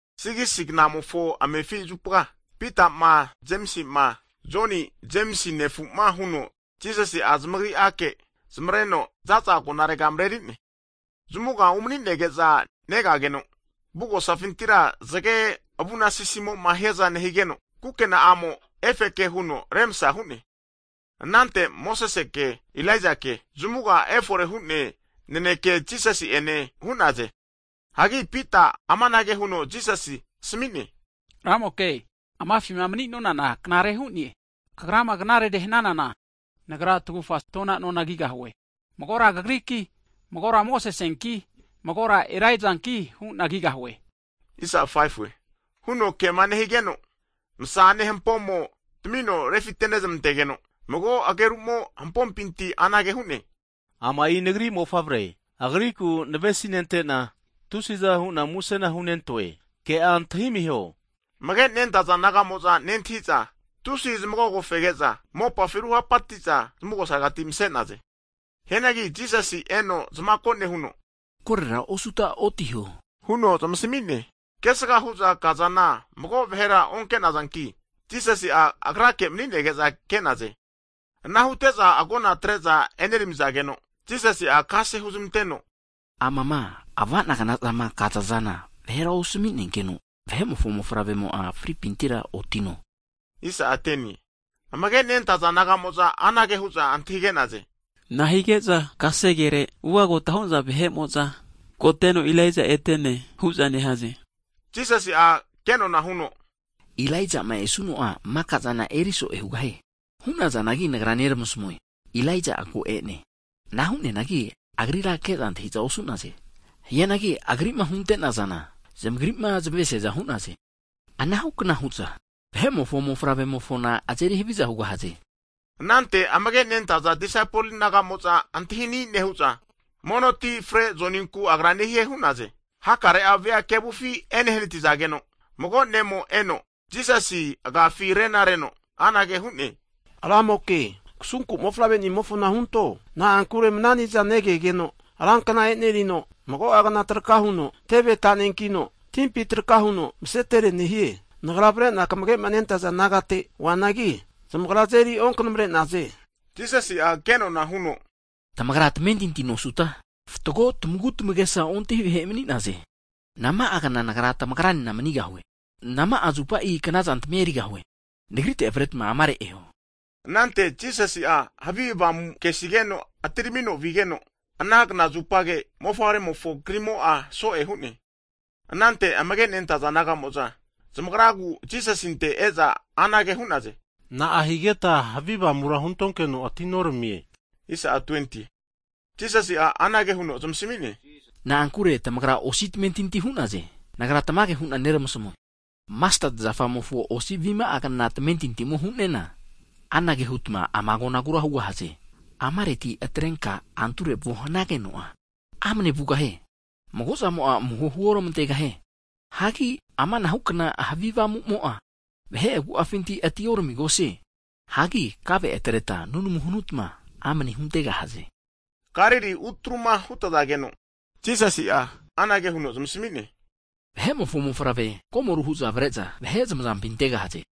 6gisi knamofo amefi zupa, Pitama, Jemisima, Jonima Jemisi nefu'ma huno Jisasi'a zamagri'ake zmareno zaza agonarega mreri'ne. Zmuga umninege'za negageno, avugosafintira zge avunasisimo hiaza nehigeno, kukena'amo efeke huno remsa hu'ne. Anante Mosesi ene Ilaijake zamuga efore hu'ne naneke Jisasi' ene hu'naze. Hagi Pita'a amanage huno Jisasi asmi'ne, Ramoke, amafima mni'nonana knare hu'ne, Kagrama knarere hananana, nagra tagufa tona nona kigahue. Magora Kagriki, magora Mosesinki, magora Ilaijanki hu'na kigahue, huno kema nehigeno, msa'ane hampomo tmino refite nezmantegeno, mago ageru'mo hampopinti anage hu'ne, Ama'i Nagri Ne'mofavre, Agriku navesi nentena, tusiza hu'na musena hunentoe, ke'a antahi amiho! Amage' nentaza disaipol nagamo'za nentahi'za tusi zmagogo fege'za mopafi ruhapati'za zmugosaregati mse'naze. Hianagi Jisasi eno zmako nehuno, koro osuta otiho, huno zmasmi'ne. Kesga hu'za kazana mago'a vahera onke'nazanki, Jisasi'a Agrake mni'nege'za ke'naze. Ana hute'za agona atre'za eneramizageno, Jisasi'a kase huzmanteno, Amama avana'gnazama kazazana mago vahera osmi'nenkeno, Vahe'mofo mofavremo fripintira otino. Amage nentaza disaipol nagamo'za anage hu'za antahige'naze. Nahige'za kasegere ugagota hu'naza vahe'mo'za, koteno Ilaija'a ete'ne hu'za nehaze? Jisasi'a kenona huno, Ilaija'ma esuno'a maka'zana emeri zo'e hugahie. Hu'nazanagi Nagra neramasmue, Ilaija'a ko e'ne. Ana hu'neanagi agrira ke'za antahi'za osu'naze. Hianagi Agri'ma hunte'nazana, zamagri'ma zmesiaza hu'naze. Anahukna hu'za, Vahe'mofo mofavre'mofona azeri haviza hugahaze. Anante amage nentaza disaipol nagamo'za antahini nehu'za, mono ti frezmante Joninku Agra nehie hu'naze. Hakare vea kevufi enehnatigeno, mago ne'mo eno, Jisasi agafi rena reno, anage hu'ne, Ramoke, kasunku mofavre nimofona hunto, na'ankure mananiza negegeno ran kna enerino, mago'a kna traka huno teve tanenkino, timpi traka huno masetere nehie. Nagra avare'na kamage'ma nentaza disaipol nagate oanagi, zamagra azeri onkanamre'naze. Jisasi'a kenona huno, tamagra tamentinti nosuta fatgo tamagutmagesa ontahi vahe mni'naze! Nama'a kna Nagra tamagra nena manigahue? Nama'a zupa knaza tmia erigahue? Nagrite avretma amare eho. Anante Jisasi'a havi avamu kesigeno atiramino vigeno, ana knazupage mofavremofo krimo'a so'e hu'ne. Anante amage' nentaza disaipol nagamo'za zamagraku Jisasinte e'za anage hu'naze. Na'a higeta havi avamura huntonkeno atinoramie. Jisasi'a anage huno zmasmi'ne, na'ankure tamagra osi'a tamentinti hu'naze. Nagra tamage hu'na neramasmue, masteti zafamofo osi avima'agna tamentintimo hu'nena, anage hutma ama agonagura hugahaze. Amarera atrenka anture vuo hanageno'a, amne vugahie. Mago'zamo'a amuho huormantegahie. [Hagi amanahukna havi avamumo'a, vahe agu'afinti atioramigahie. Hagi kave atretma nunamuma hanutma amne huntegahaze.] Galili utruma hutazageno, Jisasi'a anage huno zmasmi'ne, Vahe'mofo Mofavre komoru hu'za avare'za vahe zmazampi antegahaze.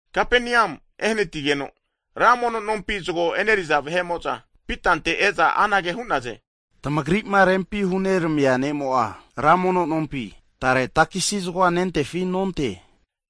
Kapenium etageno ra mono nompi zgo e'neriza vahe'mo'za, Pitante e'za anage hu'naze, tamagri'ma rempi huneramia ne'mo'a, ra mono nompi tare takesi zgoa nentefi nonte?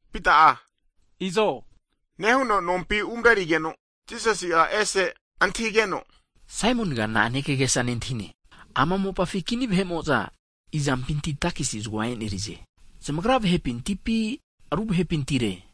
Pita'a izo nehuno nompi umrerigeno, Jisasi'a e'se antahigeno, Saimoniga na'ane kagesa nentahine? Ama mopafi kini vahe'mo'za izampinti takesi zgoa e'nerize? Zamagra vahepintipi ru vahepintire?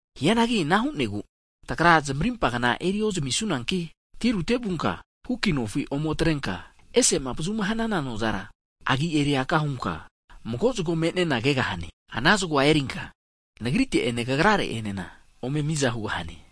Hianagi ana hu'negu tagra zmarimpa kna eri ozmisunanki, tirute vunka huku nofi ome atrenka ese'ma avazu hanana nozara agi eri aka hunka mago zgo me'nena kegahane. Ana zgo erinka Nagrite'ene kagra re'enena ome miza hugahane.